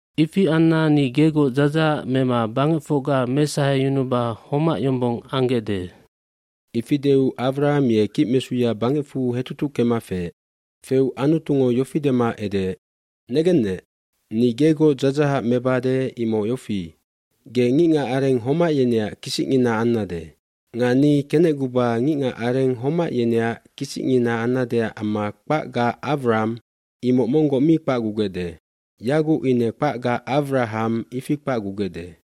aIfi anna ni gegoc dzadzahac mema bangecfocga mesaheyunuba homac yombong ambesandae.” Ifi deu Awram ye kicmesuya bangecfu hetutuckema feec. Feu Anutungo yofi dema edeec, “Negennec, ni gegoc dzadzahac mebade imoc yofi, ge ngicngacareng homac yeneac kisicngina ambesannec. dNga ni faiguai, imoc ge ngicngacareng homac yeneac kisicngina ambesannecac amma kpacga Awramb imoc monggoc mi kpacgugecde. Yaguc ine kpacga Awrahamc ifi kpacgubesandae.”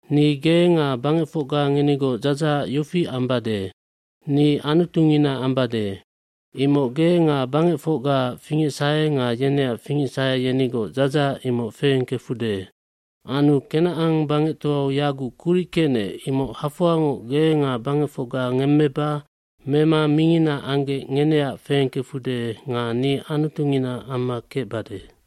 eNi ge nga bangecfocga ngenigoc dzadzahac yofi ambade ni Anutungina amma kecengkecbesandua. Imoc ge nga bangecfocgaac fingecsahe nga yeneac fingecsahe yenigoc dadzahac imoc feengkecbesande. fAnu Kenacan bangectoau yaguc kuric kecnec imoc hafoangoc ge nga bangecfocga ngemmeba mema mingina anggec ngeneac feengkecbesande nga ni Anutungina amma kecbesandua.”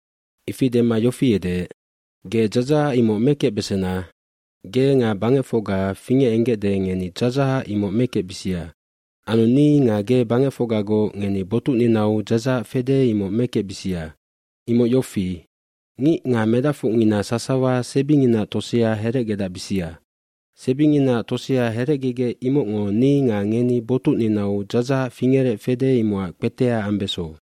Ifi dema yofi edeec, “Ge dzadzahac imoc mekecbesena, ge nga bangecfocga fingecenggecde ngeni dzadzahac imoc mekecbisia. gAnu ni nga ge bangecfocgagoc ngeni botucninau dzadzahac fede imoc mekecbisia. Imoc yofi, ngic nga medacfocngina sasawa sebinginaac tosea herecgedacbisia. Sebinginaac tosea herecgegec imocngo ni nga ngeni botucninau dzadzahac fingerec fede imocac kpetea ambeso.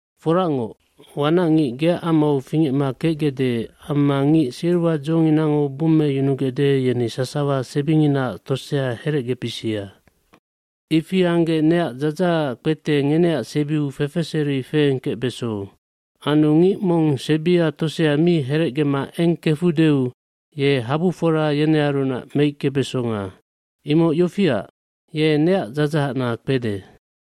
Foracngoc, wanacngic geac amau fingecma kecgecde amma ngic silwadzonginango bummeyunugecde yeni sasawa sebinginaac tosea herecgebisia. Ifi anggec neac dzadzahacac kpete ngeneac sebiu fefeseri feengkecbeso. Anu ngic mong sebia tosea mi herecgema eng kefudeu ye habufora yenearunac meickebesonga. Imoc yofiac, ye neac dzadzahacna kpede.”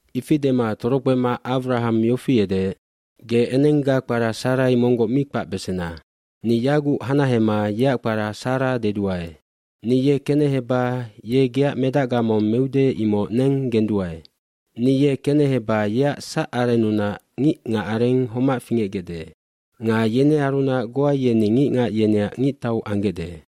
Ifi dema torokpema Awraham yofi edeec, “Ge enengga kpara Sarai monggoc mi kpacbesena. Ni yaguc hanahema yeac kpara Sarah deduae. Ni ye keneheba ye geac medacga mong meude imoc neng genduae. Ni ye keneheba yeac sacarennunac ngicngacareng homac fingecbesandae. Nga yenearunac goa yeni ngicngac yeneac ngictau ambesandae.”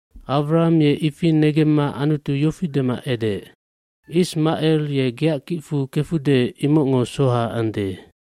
Awraham ye ifi negemma Anutu yofi dema edeec, “Ismacel ye geac kicfu kefude imocngo soha ande.”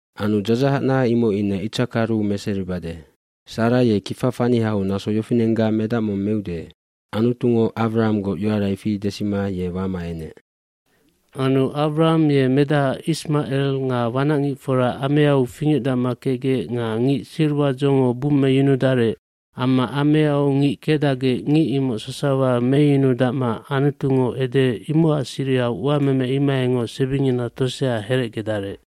mAnu dzadzahacna imoc ine Itsakaru meseribade. Sara ye kifa fanihau naso yofinenggac meude.” Anutungo Awrahamgoc yoara ifi desima ye wama enec. Anu Awraham ye medaha Ismacel nga wanacngicfora ameau fingecdacma kecgec nga ngic silwadzongo bummeyunudarec amma ameau ngic kecdacgec ngic imoc sasawa meyunudacma Anutungo edeec imocac sirihau uameme imohaingoc sebingina tosea herecgedarec.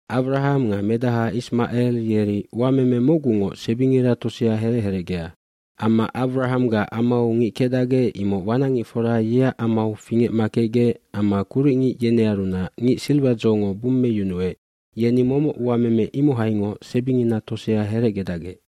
Awraham nga medaha Ismacel yeri uameme mocgungoc sebingira tosea herec herecgea. Amma Awrahamgac amau ngic kecdacgec imoc wanacngicfora yeac amau fingecma kecgec amma kuricngic yenearunac ngic silwadzongo bummeyunuec yeni momoc uameme imohaingoc sebingina tosea herecgedacgec.